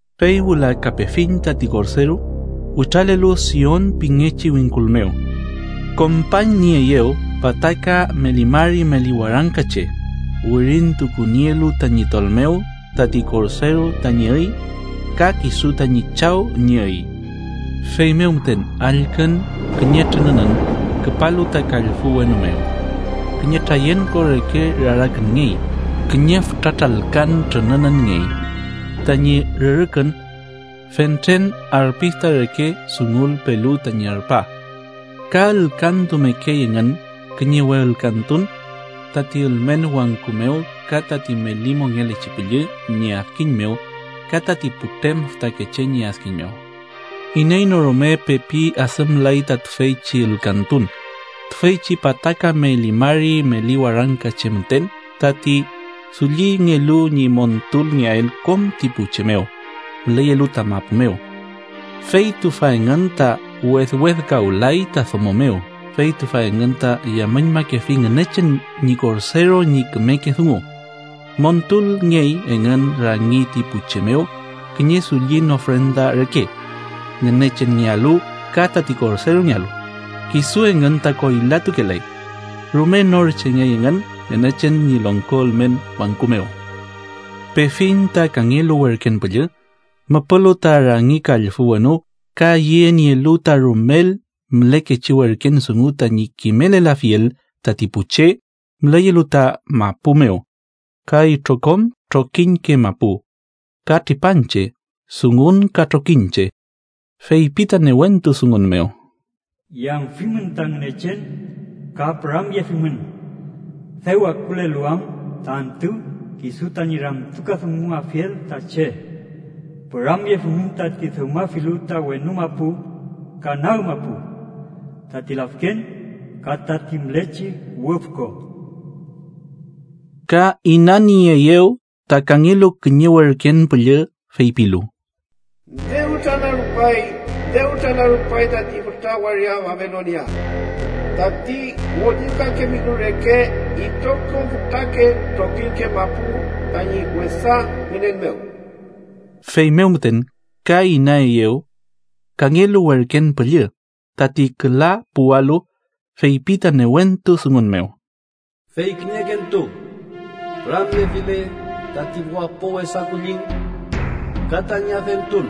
Fey wüla ka pefiñ tati Korderu, witralelu Sion pingechi wingkul mew. Kompañnieeyew pataka meli mari meli warangka che, wirintukunielu tañi tol mew tati Korderu tañi üy ka kisu tañi Chaw ñi üy. Feymew müten allkün kiñe trününün küpalu ta kallfü wenu mew. Kiñe trayenko reke rarakünngey, kiñe fütra tralkan trünününngey, tañi rürükün fentren arpista reke dungulpelu tañi arpa. Ka ülkantumekey engün kiñe we ülkantun tati ülmen wangku mew ka tati meli mongelechi püllü ñi adkiñ mew ka tati putrem fütakeche ñi adkiñ mew. Iney no rume pepi adümlay ta tüfeychi ülkantun, tüfeychi pataka meli mari meli warangka che müten tati dullingelu ñi montulngeael kom ti pu che mew müleyelu ta mapu mew. Fey tüfa engün ta wedwedkawlay ta domo mew, fey tüfa engün ta yamüñmakefi Ngünechen ñi Korderu ñi kümeke dungu. Montulngey engün rangi tati pu che mew kiñe dullin ofrenda reke Ngünechenngealu ka tati Korderungealu. Kisu engün ta koylatukelay. Rume nor chengey engün Ngünechen ñi longko ülmen wangku mew. Pefiñ ta kangelu werken püllü, müpülu ta rangi kallfü wenu ka yenielu ta rumel mülekechi werken dungu tañi kimelelafiel tati pu che müleyelu ta mapu mew, ka itrokom trokiñke mapu, ka tripanche, dungun ka trokiñche. Feypi ta newentu dungun mew: “Yamfimün ta Ngünechen ka püramyeafimün, dew akulelu am ta antü kisu tañi ramtukadunguafiel ta che. Püramyefimün tati dewmafilu ta wenu mapu ka nag mapu, tati lafken ka tati mülechi wüfko.” Ka inannieeyew ta kangelu kiñe werken püllü feypilu: “¡Dew tranarupay, dew tranarupay tati fütra waria Babilonia, tati ngollilkakefilu reke itrokom fütrake trokiñke mapu tañi wesa ngünen mew!” Feymew müten ka inaeyew kangelu werken püllü, tati küla puwalu, feypi ta newentu dungun mew: “Fey kiñekentu püramyefile tati wapo wesa kulliñ ka tañi adentun,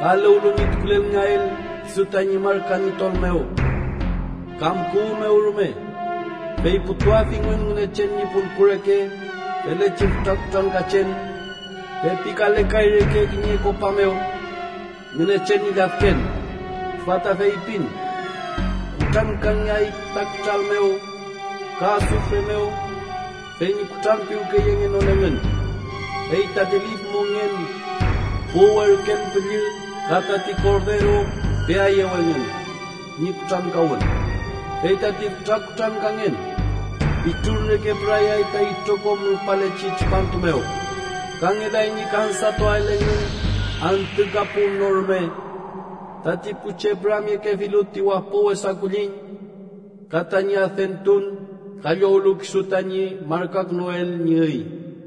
ka eluwlu ñi tukulelngeael kisu tañi marka ñi tol mew kam kuwü mew rume, fey putuafingün Ngünechen ñi pulku reke felechi fütra kutrankachen pepikalekay reke kiñe kopa mew Ngünechen ñi lladken, tüfa ta feypin: kutrankangeay ta kütral mew ka asufre mew fey ñi kutranpiwkeyengenon engün. Fey tati lif mongen pu werken püllü ka tati Korderu peaeyew engün ñi kutrankawün. Fey tati fütra kutrankangen pitrun reke pürayay ta itrokom rupalechi tripantu mew, ka ngelay ñi kansatuael engün antü ka pun no rume tati pu che püramyekefilu ti wapo wesa kulliñ ka tañi adentun ka llowlu kisu tañi markakünuel ñi üy.”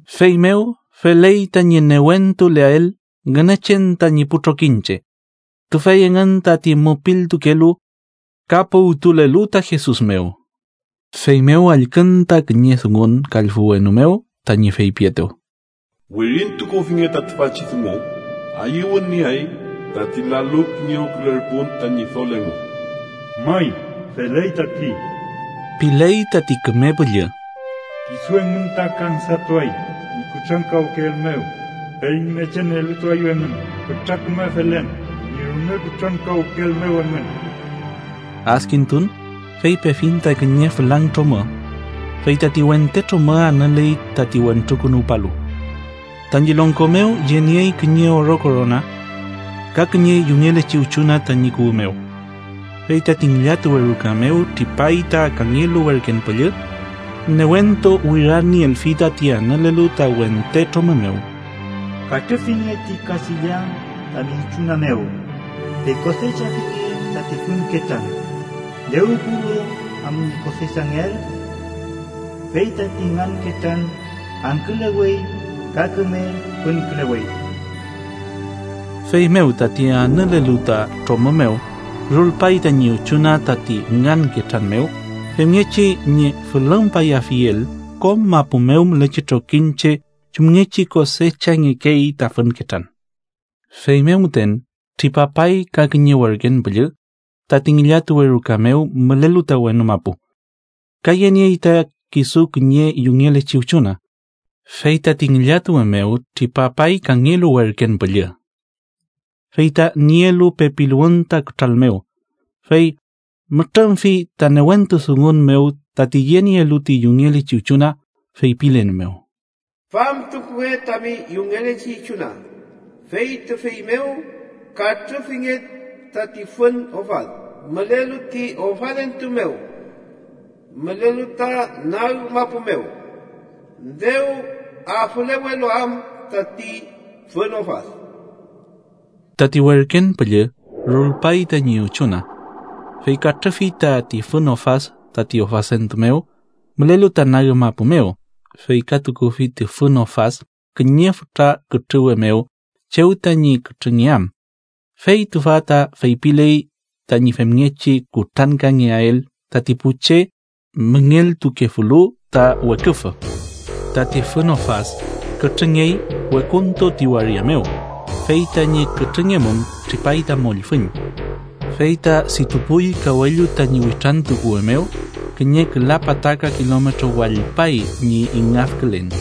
¡Feymew feley tañi newentuleael Ngünechen tañi pu trokiñche, tüfey engün tati mupiltukelu ka puwtulelu ta Jesus mew! Feymew allkün ta kiñe dungun kallfü wenu mew, tañi feypietew: “Wirintukufinge ta tüfachi dungu: Ayüwün nieay tati lalu kiñewkülerpun ta Ñidol engu. “May, feley tati” piley tati Küme Püllü. “Kisu engün ta kansatuay ñi kutrankawkeel mew, fey Ngünechen elutuaeyew engün fütra küme felen ñi rume kutrankawkeel mew engün.” Adkintun, fey pefiñ ta kiñe fülang tromü, fey tati wente tromü anüley tati Wentrukünuwpalu, tañi longko mew yeniey kiñe oro korona ka kiñe yungelechi üchuna tañi kuwü mew. Fey tati ngillatuwe ruka mew tripay ta kangelu werken püllü, newentu wirarnielfi tati anülelu ta wente tromü mew: “¡Katrüfinge ti kachilla tami üchuna mew, fey kosechafinge tati fün ketran, dew puwlu am ñi kosechangeael, fey tati ngan ketran angkülewey ka küme fünkülewey!” Feymew tati anülelu ta tromü mew rulpay tañi üchuna tati ngan ketran mew, femngechi ñi fülümpayafiel kom mapu mew mülechi trokiñche chumngechi kosechangekey ta fün ketran. Feymew müten tripapay ka kiñe werken püllü tati ngillatuwe ruka mew mülelu ta wenu mapu, ka yeniey ta kisu kiñe yungelechi üchuna. Fey tati ngillatuwe mew tripapay kangelu werken püllü, fey ta nielu pepiluwün ta kütral mew, fey mütrümfi ta newentu dungun mew tati yenielu ti yungelechi üchuna, feypilen mew: “¡Famtukunge tami yungelechi üchuna, fey tüfey mew katrüfinge tati fün ofad mülelu ti ofadentu mew mülelu ta nag mapu mew, dew afülewelu am tati fün ofad!” Tati werken püllü rulpay tañi üchuna, fey katrüfi tati fün ofad tati ofadentu mew mülelu ta nag mapu mew, fey ka tukufi ti fün ofad kiñe fütra kütrüwe mew chew tañi kütrüngeam. Fey tüfa ta feypiley tañi femngechi kutrankangeael tati pu che müngeltukefulu ta weküfü. Tati fün ofad kütrüngyey wekuntu ti waria mew, fey tañi kütrüngngemum tripay ta mollfüñ, fey ta ditupuy kawellu tañi witrantukuwe mew kiñe küla pataka kilometro wallpay ñi ingafkülen.